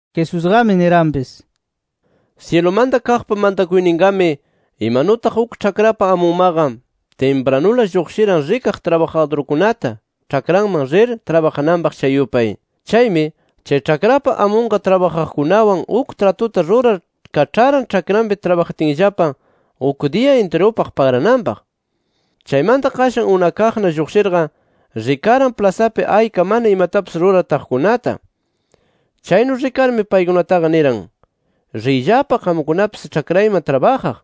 Jesusqami niranpis: “Syilumanta kaqpa mantakuyninqami imanutaq uk ĉhakrapa amunmaqa timpranula lluqshiran rikaq trabajadurkunata, ĉhakranman rir trabajananpaq chay yupay. Chaymi, chay ĉhakrapa amunqa trabajaqkunawan uk tratuta rurar kaĉharan ĉhakranpi trabajatinllapa uk diya intirupaq pagrananpaq. “Chaymanta qashan unakaqna lluqshirqa rikaran plasapi ayka mana imatapis rurar taqkunata. Chaynu rikarmi paykunataqa niran: ‘Riyllapa qamkunapis ĉhakrayman trabajaq.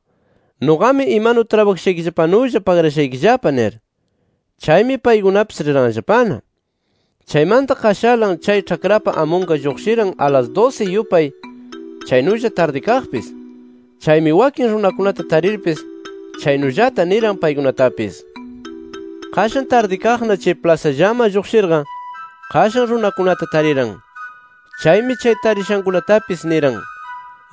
Nuqami imanu trabajashaykillapanulla pagrashaykillapa’ nir. Chaymi paykunapis riranllapana. “Chaymanta qashalan chay ĉhakrapa amunqa lluqshiran a las dusi yupay, chaynulla tardikaqpis. Chaymi wakin runakunata tarirpis chaynullata niran paykunatapis. “Qashan tardikaqna chay plasallaman lluqshirqa, qashan runakunata tariran. Chaymi chay tarishankunatapis niran: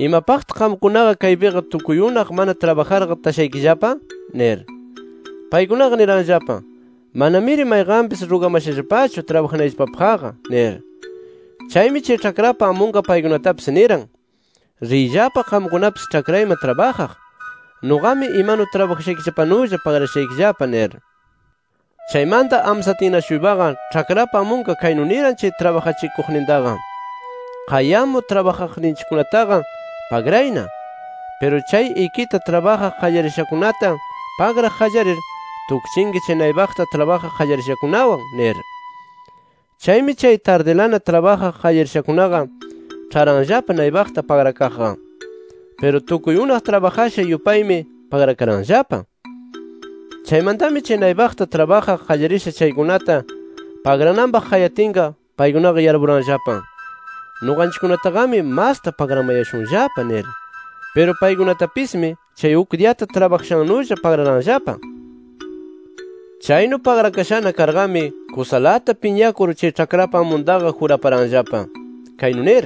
‘¿Imapaqtaq qamkunaqa kaypiqa tukuy unaq mana trabajarqa tashaykillapa?’ nir. Paykunaqa niranllapa: ‘Manamiri mayqanpis rugamashallapachu trabajanayllapapaqqa’ nir. Chaymi chay ĉhakrapa amunqa paykunatapis niran: ‘Riyllapa qamkunapis ĉhakrayman trabajaq. [Nuqami imanu trabajashaykillapanulla pagrashaykillapa]’ nir. “Chaymanta amsatinna-shuypaqa, ĉhakrapa amunqa kaynu niran chay trabajachikuqnintaqa: ‘Qayamur trabajaqninchikkunataqa pagrayna. Piru chay ikita trabajaq qallarishakunata pagraq qallarir, tukchinki chay naypaqta trabajaq qallarishakunawan’ nir. “Chaymi, chay tardilana trabajaq qallarishakunaqa ĉharanllapa naypaqta pagrakaqqa. Piru tukuy unaq trabajasha yupaymi pagrakaranllapa. Chaymantami chay naypaqta trabajaq qallarisha chaykunata pagrananpaq qayatinqa, paykunaqa yarpuranllapa: Nuqanchikkunataqami masta pagramayashunllapa nir. Piru paykunatapismi chay uk diyata trabajashannulla pagraranllapa. Chaynu pagrakashana karqami kusalata piñakur, chay ĉhakrapa amuntaqa juraparanllapa, kaynu nir: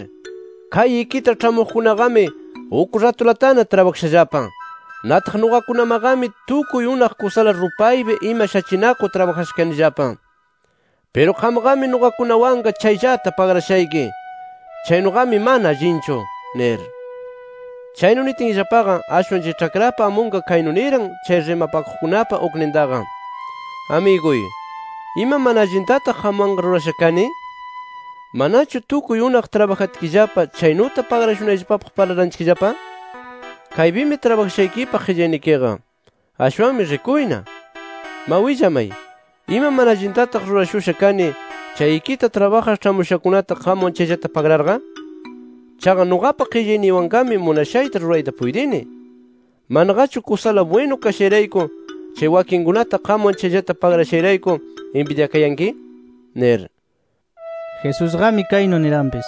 ‘Kay ikita ĉhamuqkunaqami uk ratulatana trabajashallapa. Nataq nuqakunamaqami tukuy unaq kusala rupaypi ima shachinakur trabajasha kanillapa. Piru qamqami nuqakunawanqa chayllata pagrashayki. Chaynuqami mana allinchu’ nir. “Chaynu nitinllapaqa, ashwan chay ĉhakrapa amunqa kaynu niran chay rimapakuqkunapa uknintaqa: ‘¿Amiguy, ima mana allintataq qamwanqa rurasha kani? ¿Manachu tukuy unaq trabajatkillapa chaynuta pagrashunayllapapaq parlaranchikllapa? Kaypimi trabajashaykipaq qillaynikiqa. Ashwanmi rikuyna. Ma willamay, ¿ima mana allintataq rurashusha kani, chay ikita trabajaq ĉhamushakunata qamwan chayllata pagrarqa? Chaqa nuqapa qillayniywanqami munashayta rurayta puytini. ¿Manaqachu kusala bwinu kashayrayku, chay wakinkunata qamwan chayllata pagrashayrayku inbidyakayanki?’ nir”. Jesusqami kaynu niranpis: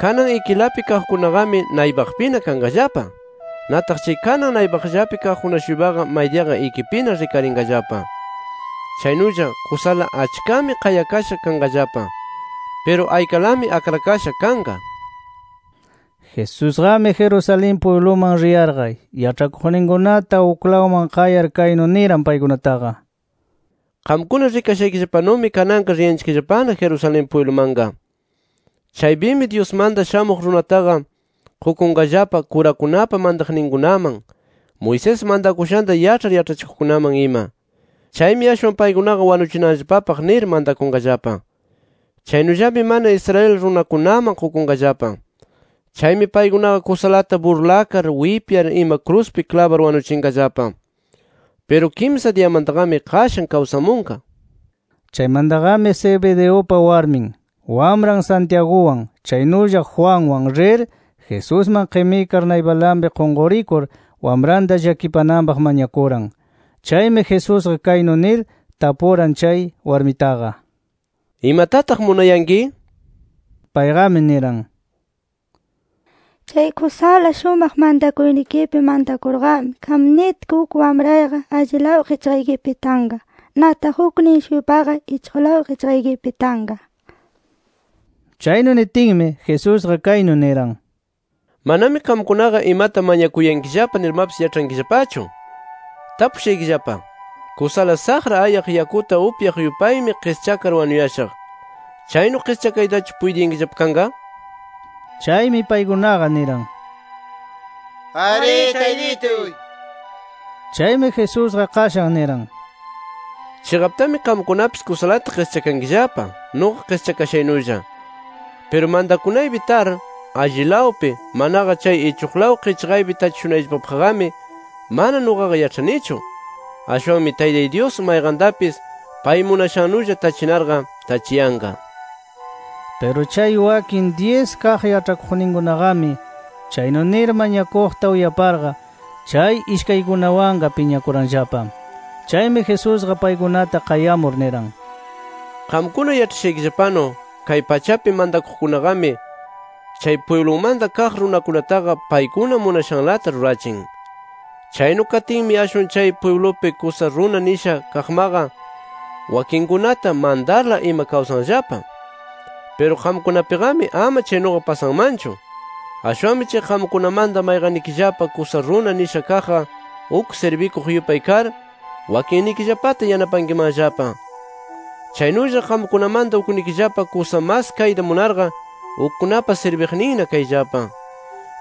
“Kanan ikilapi kaqkunaqami naypaqpina kanqallapa. Nataq chay kanan naypaqllapi kaqkuna-shuypaqa maydiyaqa ikipina rikarinqallapa. [Chaynulla kusala achkami qayakasha kanqallapa. Piru aykalami akrakasha kanqa]” nir. Jesusqami Jerusalén pwibluman riyarqa yaĉhakuqninkunata, uklawman qayar kaynu niran paykunataqa: “Qamkuna rikayashaykillapanumi kananqa riyanchikllapana Jerusalén pwiblumanqa. Chaypimi Dyusmanta Shamuq Runataqa qukunqallapa, kurakunapa mantakuqninkunaman, Moisés mantakushanta yaĉhar yaĉhachikuqkunaman ima. Chaymi ashwan paykunaqa wanuchinanllapapaq nir mantakunqallapa. Chaynullami mana Israel runakunaman qukunqallapa. Chaymi paykunaqa kusalata burlakar wipyar ima kruspi klabar wanuchinqallapa. Piru kimsa diyamantaqami qashan kawsamunqa” nir. Chaymantaqami Zebedeupa warmin, wamran Santiaguwan chaynulla Juanwan rir, Jesusman qimikar naypalanpi qunqurikur, wamranta llakipananpaq mañakuran. Chaymi Jesusqa kaynu nir tapuran chay warmitaqa: —¿Imatataq munayanki? nir. Payqami niran: —Chay kusala shumaq mantakuynikipi mantakurqami, qam nitki, uk wamrayqa allilaw qichqaykipi tanqa. Nataq uknin-shuypaqa ichuqlaw qichqaykipi tanqa nir. Chaynu nitinmi, Jesusqa kaynu niran: —Manami qamkunaqa imata mañakuyankillapa nirmapis yaĉhankillapachu. Tapushaykillapa: ¿Kusala saqra ayaq yakuta upyaq yupaymi qischakar wanuyashaq, chaynu qischakaytachu puytiyankillapa kanqa? nir. Chaymi paykunaqa niran: —Arí Taytituy nir. Chaymi Jesusqa qashan niran: —Chiqaptami qamkunapis kusalata qischakankillapa, nuqa qischakashaynulla. Piru mantakunaypi tar allilawpi manaqa chay ichuqlaw qichqaypi tachishunayllapapaqqami, mana nuqaqa yaĉhanichu. Ashwanmi Taytay Dyus mayqantapis pay munashannulla tachinarqa tachiyanqa nir. Piru chay wakin dyis kaq yaĉhakuqninkunaqami chaynu nir mañakuqta uyaparqa, chay ishkaykunawanqa piñakuranllapa. Chaymi Jesusqa paykunata qayamur niran: “Qamkuna yaĉhashaykillapanu, kay pachapi mantakuqkunaqami, chay pwiblumanta kaq runakunataqa paykuna munashanlata rurachin. Chaynu katinmi ashwan chay pwiblupi kusa runa nisha kaqmaqa, wakinkunata mantarla ima kawsanllapa. Piru qamkunapiqami ama chaynuqa pasanmanchu. Ashwanmi chay qamkunamanta mayqannikillapa kusa runa nisha kaqqa, uk sirbikuq yupay kar wakinnikillapata yanapankimanllapa. Chaynulla qamkunamanta uknikillapa kusa mas kayta munarqa, ukkunapa sirbiqninna kayllapa.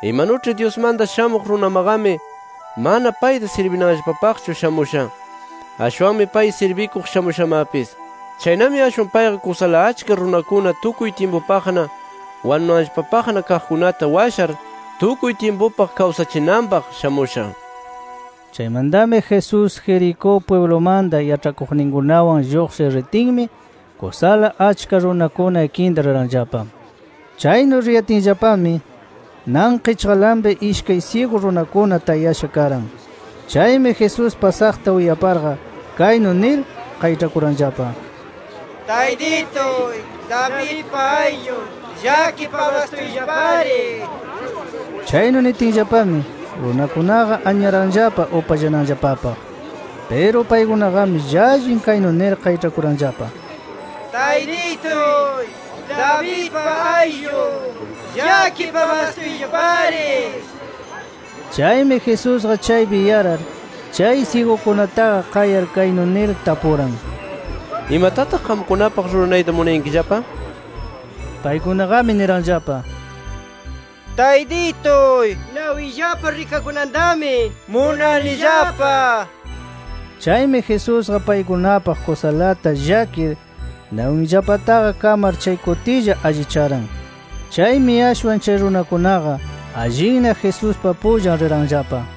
Imanuĉhi Dyusmanta Shamuq Runamaqami mana payta sirbinanllapapaqchu shamusha. Ashwanmi pay sirbikuq shamushamapis. Chaynami ashwan payqa kusala achka runakuna tukuy tyimpupaqna wanunanllapapaqna kaqkunata washar tukuy tyimpupaq kawsachinanpaq shamusha”. Chaymantami Jesús, Jericó pwiblumanta yaĉhakuqninkunawan lluqshir ritinmi, kusala achka runakuna ikinta riranllapa. Chaynu riyatinllapami nan qichqalanpi ishkay syigu runakuna tayasha karan. Chaymi Jesús pasaqta uyaparqa, kaynu nir qayĉhakuranllapa: —¡Taytituy, Davidpa ayllun, llakipamastuyllapari! nir. Chaynu nitinllapami, runakunaqa anyaranllapa upallananllapapaq. Piru paykunaqami llallin kaynu nir qayĉhakuranllapa: —¡Taytituy, Davidpa ayllun, llakipamastuyllapari! nir. Chaymi Jesusqa chaypi yarar, chay syigukunataqa qayar, kaynu nir tapuran: —¿Imatataq qamkunapaq ruranayta munayankillapa? nir. Paykunaqami niranllapa: —Taytituy, nawiyllapa rikakunantami munanillapa nir. Chaymi Jesusqa paykunapaq kusalata llakir, nawinllapataqa kamar chay kutilla allicharan. Chaymi ashwan chay runakunaqa allinna, Jesuspa pullan riranllapa.